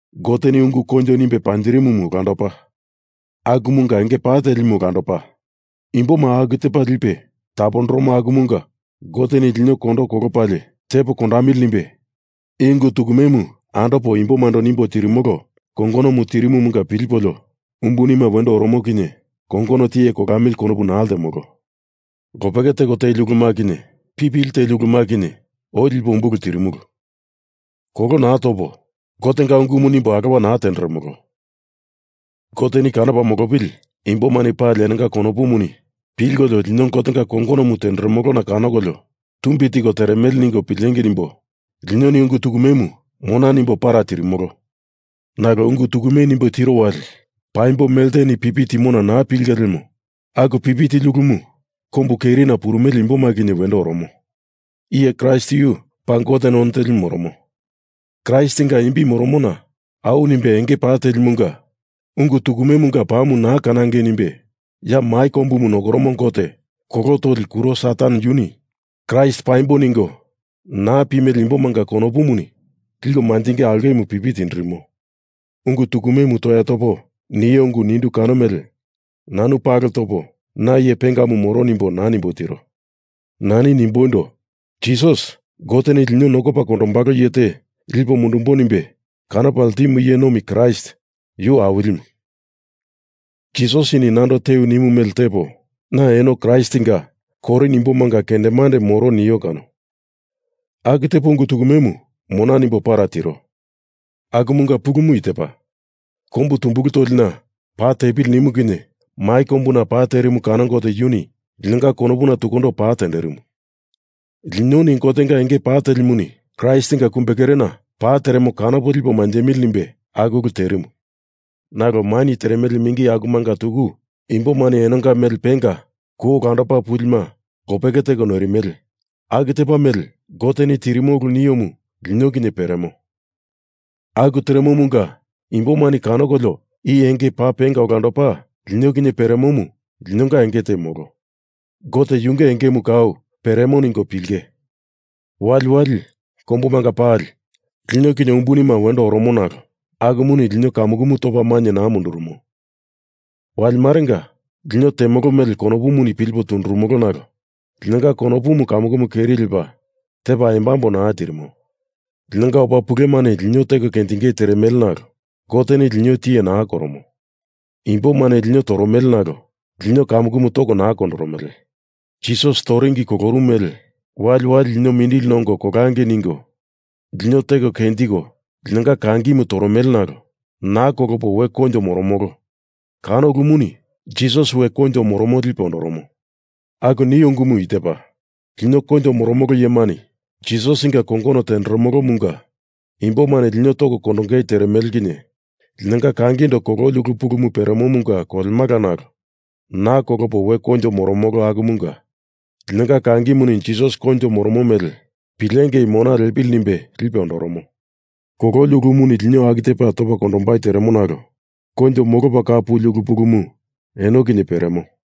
Goteni ungu koinjo nimbe panjirimumu olandopa, akumunga enge pa telimu olandopa. Imboma aku tepa lipe tapondoromo akumunga Goteni lino kondo kolopalie tepo kondamili nimbe i ungu tukumemu andopo imbomando nimbo tirimolo kongonomu tirimumunga pilipolio umbunima wendo oromo kinye kongono tiye kolamili konopu naa ltemolo. Lopeke teko teli uluma kinye, pipili teli uluma kinye, oi lipo umbulu tirimulu. Kolo naa topo, Gotenga ungumu nimbo alowa naa tenderemolo. Goteni kanopa molopili imbomani pali enonga konopuni pilkolio lino Gotenga kongonomu tenderemolona kanokolio tumbi tiko teremele ningo pilengei nimbo linoni ungu tukumemu mona nimbo para tirimolo. Nalo ungu tukume nimbo tiro wali paimbo melteni pipi timona naa pilinge lemo aku pipi tili ulumu kombu kerina purumele imboma kinye wendo oromo. Iye Kraist yu paa Gote none telimu moromo. Kraistinga imbi moromona au nimbe enge pa telimunga ungu tukumemunga pamu naa kanangei nimbe ya mai kombumu nokoromo gote kolo toli kuro Satan yuni Kraist paimbo ningo naa pimele imbomanga konopuni liko manjingei aulkemu pipi tindirimo. Ungu tukumemu toya topo nio ungu nindu kano mele, nanu palo topo na iye pengamu moro nimbo naa nimbo tiro. Nani nimboindo, Jisas, Goteni lino nokopa kondombalo iye te lipo mundumbo nimbe kanopa ltimu iye nomi Kraist, yu Awilimu. Jisasini nando tewi nimu mele tepo, na eno Kraistinga Korin imbomanga kendemandemu moro nio kano, aku tepo ungu tukumemu mona nimbo para tiro. Akumunga pulumu i tepa. Kombu tumbulu tolina pa tepili nimu kinye mai kombuna pa terimu kano Gote yuni linonga konopuna tukundo pa tenderimu. Linoni Gotenga enge pa telimuni Kraistinga kumbekerena pa teremo kanopo lipo manjemili nimbe aku ulu terimu. Nalo maini teremele mingi akumanga tuku imbomani enonga mele penga kou olandopa pulima lopeke teko noirimele aku tepa mele Goteni tirimo ulu niomu lino kinye peremo. Aku teremomunga imbomani kanokolio i enge paa penga olandopa lino kinye peremomu linonga enge te molo. Gote yunge engemu kau peremo ningo pilinge. Waliwali, kombumanga pali, lino kinye umbunima wendo oromo nalo akumuni lino kamukumu topa mainye naa mundurumo. Wali marenga lino temolo mele konopuni pilipo tunduromolo nalo linonga konopumu kamukumu keri lepa tepa embambo naa tirimo. Linonga opa pulemani lino teko kenjingei teremele nalo Goteni lino tiye naa koromo. Imbomani lino toromele nalo lino kamukumu toko naa kondoromele. Jisas toringi kolorumu mele waliwali lino mindili nongo kolangei ningo lino teko kenjiko linonga kangimu toromele nalo naa kolopo we koinjo moromolo kano ulumuni Jisas we koinjo moromo lipe ondoromo. Aku nio ungumu i tepa. Lino koinjo moromolo iyemani Jisasinga kongonomu tenderomolomunga imbomani lino toko kondongei teremele kinye linonga kangindo kololi ulu pulumu peremomunga kolemala nalo naa kolopo we koinjo moromolo akumunga linonga kangimuni Jisas koinjo moromo mele pilengei mona liepili nimbe lipe ondoromo. Kololi ulumuni lino aku tepa topa kondombai teremo nalo koinjo molopa kau puli ulu pulumu eno kinye peremo.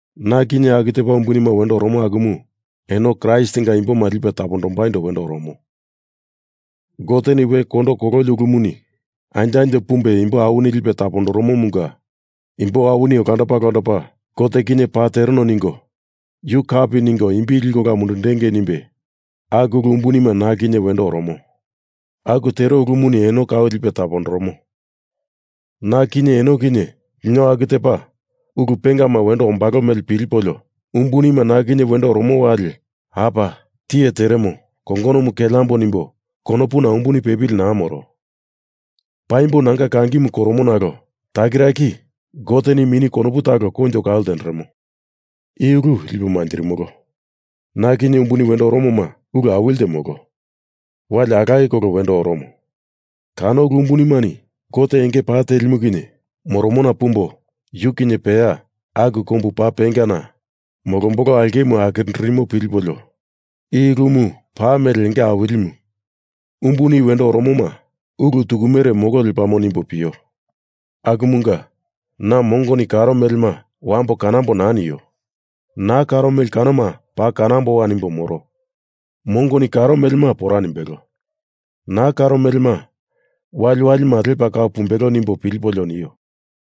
Na kinye aku tepa umbunima wendo oromo akumu eno Kraistinga imboma lipe tapondombaindo wendo oromo. Goteni we kondo kololi ulumuni anjo anjo pumbe imbo awini lipe tapondoromomunga imbo awini olandopa olandopa Gote kinye Paa tereno ningo yu kapi ningo imbi liko ola mundundengei nimbe aku ulu umbunima na kinye wendo oromo. Aku tero ulumuni eno aku tepa lipe tapondoromo, na kinye eno kinye lino aku tepa ulu pengama wendo ombalo mele pilipolio umbunima na kinye wendo oromo wali apa, tiye teremo, kongonomu keleambo nimbo konopuna umbuni pepili naa moro. Paimbo nanga kangimu koromo nalo takiraki Goteni mini konopu talo koinjo kau ltenderemo. I ulu lipo manjirimolo. Na kinye umbuni wendo oromoma ulu awili te molo; wali alaye kolo wendo oromo. Kano ulu umbunimani Gote enge pa telimu kinye moromona pumbo yu kinye peya aku kombu paa pengana molombolo aulkemu akirindirimo pilipolio i ulumu paa mele enge awilimu; umbuni wendo oromoma ulu tukumere molo lepamo nimbo pio. Akumunga, na mongoni karo melema wambo kanambo naa nio; naa karo mele kanoma paa kanamboa nimbo moro. Mongoni karo melema pora nimbelo. Naa karo melema waliwalima lepa kau pumbelo nimbo pilipolio nio.